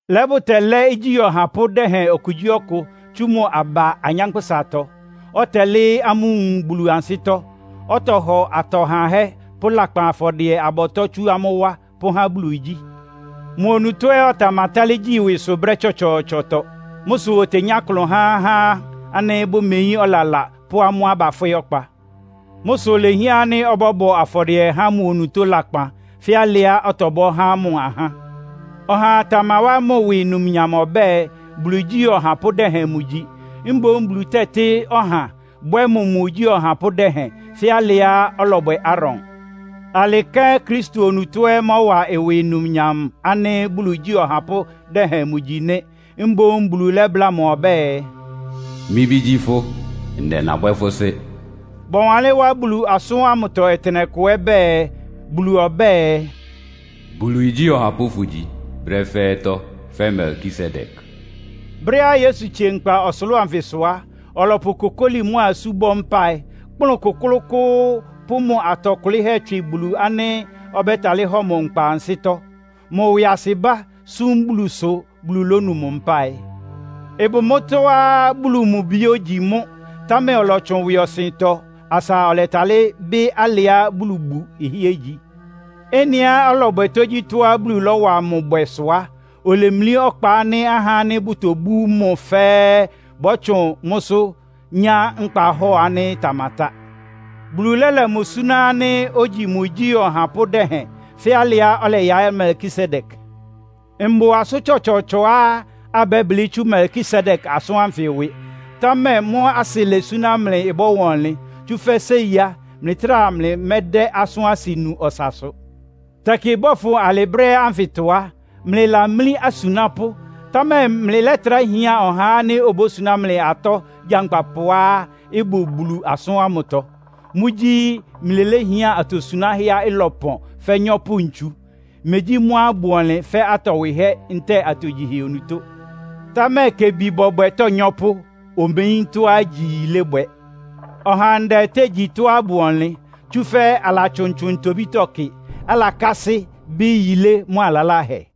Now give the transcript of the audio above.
Lɛ́ bʋtɛlɛ́ igyí ɔhapʋ́ dɛhɛn okugyíɔkʋ tsú mʋ aba anyánkpʋ́satɔ, ɔtɛlɩ́ɩ́ amʋ́ nwun Bulu ansɩ́tɔ́. Ɔtɔhɔ atɔ hahɛ́ pʋ́ lakpan afɔdɩɛ-abɔtɔ́ tsú amʋ́ wá, pʋ́há Bulu igyí. Mʋ onutó ɛ́ ɔtamatálɩ́ gyi ɩwɩsʋ brɛ́ tsɔtsɔɔtsɔtɔ. Mʋ́ sʋ otenyá klʋn há ahá ánɩ́ bʋmeyín ɔlala pʋ́ amʋ́á bafwɩ́ ɔkpa. Mʋ́ sʋ ilehián ánɩ́ ɔbɔ́bɔ afɔdɩɛ há mʋ onutó lakpan, fɛ́ alɩá ɔtɔbɔ́ há mʋ ahá. Ɔhaa tamawá mʋ ɩwɩ numnyam ɔbɛ́ɛ, Bulu igyí ɔhapʋ́ dɛhɛn mʋgyi. Mboún Bulu tɛ́tɩ́ ɔha, bwɛ́ mʋ mʋ igyí ɔhapʋ́ dɛhɛn, fɛ́ alɩá ɔlɔbwɛ Aaron. Alɩ kɛ́n Kristo onutó ɛ́ mɔ́wa ɩwɩ numnyam ánɩ́ Bulu igyí ɔhapʋ́ dɛhɛn mʋgyi nɩ́. Mboún Bulu lɛ́bláa mʋ ɔbɛ́ɛ, “Mɩ́ Bí gyí fʋ́. Ndɛ nabwɛ́ fʋ́ Sɩ́.” Bɔwanlɩ́n wá Bulu asʋ́n ámʋ ɔtɩnɛkʋ ɛ́ bɛɛ, Bulu ɔbɛ́ɛ, “Bulu igyí ɔhapʋ́ fʋ́gyi brɛ́ fɛ́ɛ́tɔ́, fɛ́ Melkisedek.” Brɛ́á Yesu tsie nkpa ɔsʋlʋ́ʋ anfɩsʋ á, ɔlɔpʋ kokóli mʋ́a isú bɔ́ mpáɩ, kplʋ́n kʋ́klʋ́kʋ́ʋ́, pʋ́ mʋ atɔ kʋlɩ́hɛ́ tswɩ Bulu ánɩ́ ɔbɛ́talɩ́ hɔ mʋ nkpa ansɩ́tɔ́. Mʋ ɩwɩasɩbá sum Bulu sʋ Bulu lónu mʋ mpáɩ. Ɩbʋ mʋ́tɔ́á Bulu mʋ Bi ogyi mʋ́, támɛ ɔlɔtsʋn ɩwɩɔsɩntɔ asa ɔlɛtalɩ́ bɩ́ alɩá Bulubu ɩhɩ́ɛ́ igyi. Ɩ́nɩá ɔlɔbwɛ tógyítɔ́á Bulu lɔ́wa mʋ bwɛ sʋ á, olemlí ɔkpa ánɩ́ ahá ánɩ́ bʋtobú mʋ fɛ́ɛ́ bɔ́tsʋn mʋ́sʋ́ nyá nkpahɔ́ɔ ánɩ́ ɩtamatá. Bulu lɛ́lɛ mʋ súná ánɩ́ ogyi mʋ igyí ɔhapʋ́ dɛhɛn, fɛ́ alɩá ɔlɛyaɩ́ Melkisedek. Mbʋ asʋ́n tsɔtsɔɔtsɔá abɛ́blɩ́ tsú Melkisedek asʋ́n ánfɩ ɩwɩ. Támɛ mʋ́ asɩlɛ súná mlɩ ɩbɔ́wa ɔnlɩn. Tsúfɛ́ séi á, mlɩtráa mlɩmɛ́dɛ́ asʋ́n asɩ nu ɔsasʋ. Tɛkɩ bɔ́fʋn alɩ brɛ́ ánfɩtɔ á, mlɩlamlí asunápʋ́, támɛ mlɩlɛ́trá hián ɔhá ánɩ́ obósuná mlɩ atɔ gyankpapʋá ɩbʋ Bulu asʋ́n ámʋtɔ. Mʋ́gyí, mlɩléhián atosuánhɛá ɩlɔpɔn fɛ́ nyɔ́pʋ-ntsu. Megyí mʋ́á ɩbʋ ɔnlɩn fɛ́ atɔ wɩhɛ́ ntɛ́ɛ atogyihɛ onutó. Támɛ kebi bɔbwɛ tónyɔ́pʋ́. Omeyín tɔ́á gyí yilébwɛ. Ɔhandɛ tégyi tɔ́á ɩbʋ ɔnlɩn, tsúfɛ́ alatsʋntsʋn ntobítɔ́ kɩ, alakásɩ́ bɩ́ yilé mʋ́a lalahɛ.